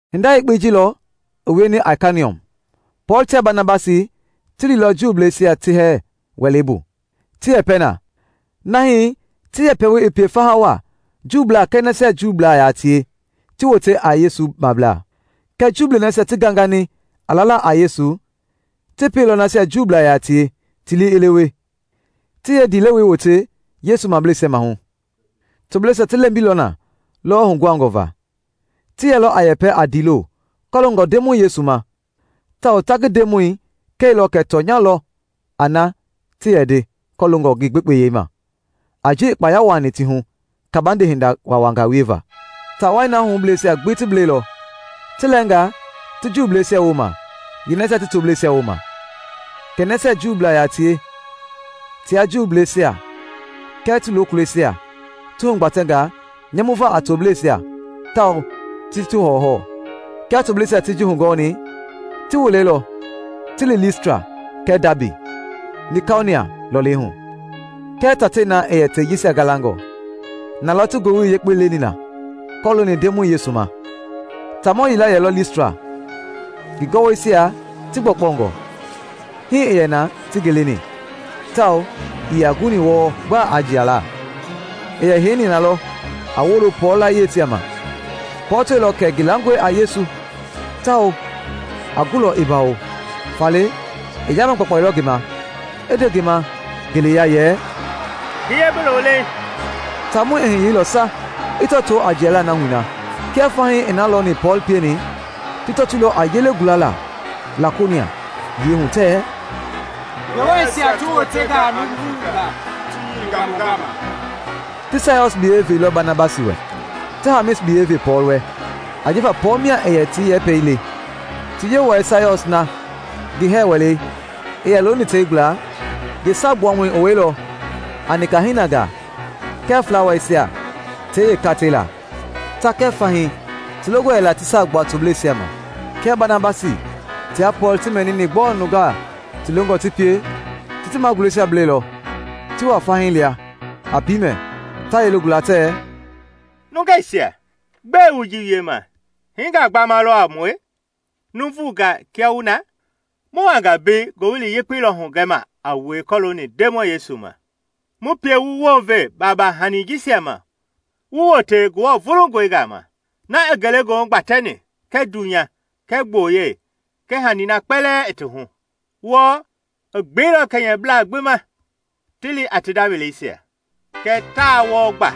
Hinda yakpei ji lɔ i wieni Aikoniɔm: Pɔɔl tia Banabasi ti liilɔ Juuisia ti hɛɛ wɛlei bu ti yɛpɛ na na hii ti yɛpɛwoi i pie faha waa, Juublaa kɛɛ nasia Juublaa yaa tie, ti wote a Yesu mablaa. Kɛɛ Juu nasia ti gangani a lala a Yesu ti pieilɔ nasia Juublaa yaa tie ti lii i lewe, ti yeendilewei wote Yesu mableisia maahu. Tobleisia ti lɛmbilɔ na lɔwɔ huguhangɔ va. Ti yɛlɔ a yɛpɛ a ndiilo kɔloongɔ Ndemɔi Yesu ma, tawao ta ngi Ndemɔi kɛilɔ kɛ tɔnya lɔ a na ti yɛ nde kɔloongɔ ngi gbekpeyei ma a ji i kpaya wuaani ti hu kabande hinda waawangaa wieva. Taa wai na hubleisia gbi ti blɛilɔ: ti lɛɛngaa ti Juuisia wooma, yeenasia ti tobleisia wooma. Kɛ nasia Juu yaa tie tia Juuisia kɛɛ ti lokulɔisia ti hugbatɛnga nyamuva a tobleisia tawao ti ti hɔwɔhɔwɔ. Kia tobleisia ti ji hugɔɔni, ti wilɛilɔ ti li Listra kɛɛ Daabi, Likaonia lɔlei hu, kɛɛ tatei na i yɛ tei jisia galangɔ. Na lɔ ti Ngowili Yekpei leni na kɔlooni Ndemɔi Yesu ma. Taamɔ yila yɛlɔ Listra ngi gɔwɔisia ti gbɔkpɔngɔ; hii i yɛ na ti ngi leni tawao ii yaa guni wɔɔ gba a jiala. I yɛ heini na lɔ a wolo Pɔɔl layieisia ma. Pɔɔl tɔilɔ kɛ ngi langɔe a Yesu tawao a gulɔ i bawo, faale i yaama gbakpailɔ ngi ma i nde ngi ma ngeleya yɛ, “Hiye bi lo leeŋ!” Taamɔi i hiyeilɔ sa i tɔtoo a jiala nahui na. Kia fahii ti na lɔni Pɔɔl pieni, ti tɔtoilɔ a yelei gulala Lakaonia yiɛi hu tɛɛ, “Ngewɔisia ti wotenga a nuuvungaa ti yeinga mu gama!” Ti Siɔs biyɛi veilɔ Banabasi wɛ, ti Hamis biyɛi ve Pɔɔl wɛ, ajifa Pɔɔl mia i yɛ ti yɛpɛi le. Ti yewɔɛi Siɔs na ngi hɛɛ wɛlei i yɛ looni tei gbla yee saagbuamɔi i wɛilɔ a nika hinangaa kɛɛ flawaisia tei yeekatei laa. Ta kɛɛ fahii ti longɔ yɛla ti saa gbua tobleisia ma. Kia Banabasi tia Pɔɔl ti mɛnini gbɔɔ nungaa ti longɔ ti pie, ti ti magulɛisia blɛilɔ ti wa fahii lia a piimɛ ta yelei gula tɛɛ, “Nungeisia, gbɛe wu ji wiema? Hiingaa gbama lɔ a mue, nuuvungaa kia wu na! Mu wanga mbei Ngowili Yekpei lɔ hugɛma a wue kɔlooni Ndemɔi Yesu ma, mu pie wu wounve baaba hani jisia ma wu wote Ngewɔ vulungɔi gama, na i ngelegoohu gbatɛni kɛɛ dunya kɛɛ gboyei kɛɛ hanii na kpɛlɛɛ i ti hu. Wɔɔ, i gbeilɔ kɛnyɛblaa gbi ma ti li a ti nda weleisia. Kɛɛ taa wɔɔ gba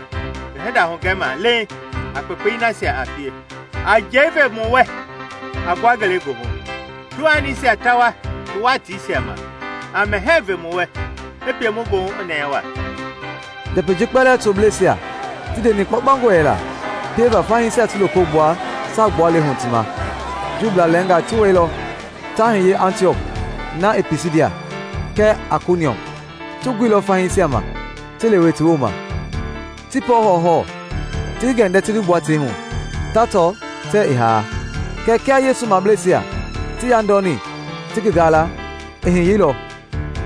ngi hinda hugɛma leeŋ a kpekpei nasia a pie: a njɛi ve mu wɛ a gbua ngelegoohu, tuhanisia ta wua ti watiisia ma; a mɛhɛɛ ve wu wɛ, i pie wu goohu i nɛɛ waa.” Njɛpɛi ji kpɛlɛɛ tobleisia ti ndeni kpaukpaungɔ yɛla pieva fahiisia ti loko gbua saa gbualei hu ti ma. Juu lɛɛngaa ti wɛilɔ ta hiye Antiɔk na i Pisidia, kɛɛ Aikoniɔm; ti guilɔ fahiisia ma ti lewe ti wooma, ti Pɔɔl hɔwɔhɔwɔ, ti ngi gɛndɛ ti ngi gbua tei hu, ta tɔ tɛɛ i haanga. Kɛɛ kia Yesu mableisia ti yandɔni ti ngi gaala, i hiyeilɔ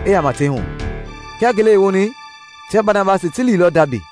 i yaama tei hu. Kia ngele i woni tia Banabasi ti liilɔ Daabi.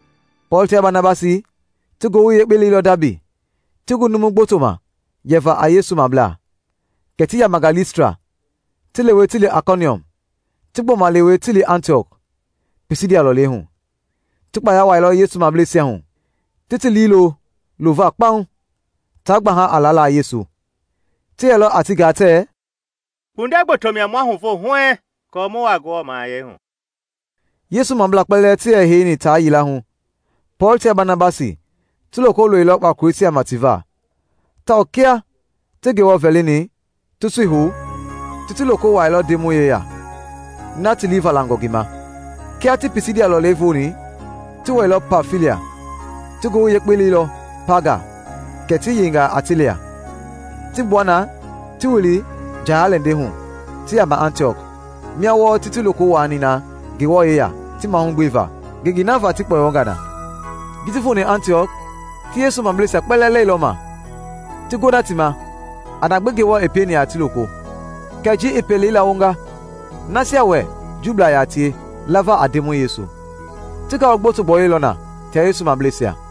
Pɔɔl tia Banabasi ti Ngowili Yekpei leilɔ Daabi, ti gu numu gboto ma yɛva a Yesu mablaa. Kɛ ti yamanga Listra, ti lewe ti li Aikoniɔm, ti gbɔma lewe ti li Antiɔk, Pisidia lɔleihu. Ti kpaya wuailɔ Yesu mableisia hu, ti ti liilo lova kpaŋ, taa gbaha a lala a Yesu. Ti yɛlɔ a ti gaa tɛɛ, “Kpundɛ gboto mia ma huvo huɛɛŋ aako mu wuaa Ngewɔ mahayɛi hu.” Yesu mablaa kpɛlɛɛ ti yɛ heini taa yila hu, Pɔɔl tia Banabasi ti loko loilɔ kpakoleisia ma ti va; tawao kia ti Ngewɔ vɛlini, ti sui hou, ti ti loko wuailɔ Ndemɔi yeya, na ti liivalanga ngi ma. Kia ti Pisidia lɔlei vooni, ti wɛilɔ Pamfilia. Ti Ngowili Yekpei leilɔ Paaga kɛ ti yeinga Atelia, ti gbua na ti wili njaya-lɛndɛi hu ti yaama Antiɔk, mia wɔɔ ti ti loko wuaani na Ngewɔ yeya ti mahugbeva ngengei na va ti kpɔyɔnga na. Ji ti foni Antiɔk ti Yesu mableisia kpɛlɛɛ lɛilɔma, ti gona ti ma a na gbi Ngewɔ i pieni a ti loko, kɛɛ ji i pelei lawonga nasia wɛ Juublaa yaa tie lava a Ndemɔi Yesu. Ti ngalu gboto gbɔyɔilɔ na tia Yesu mableisia.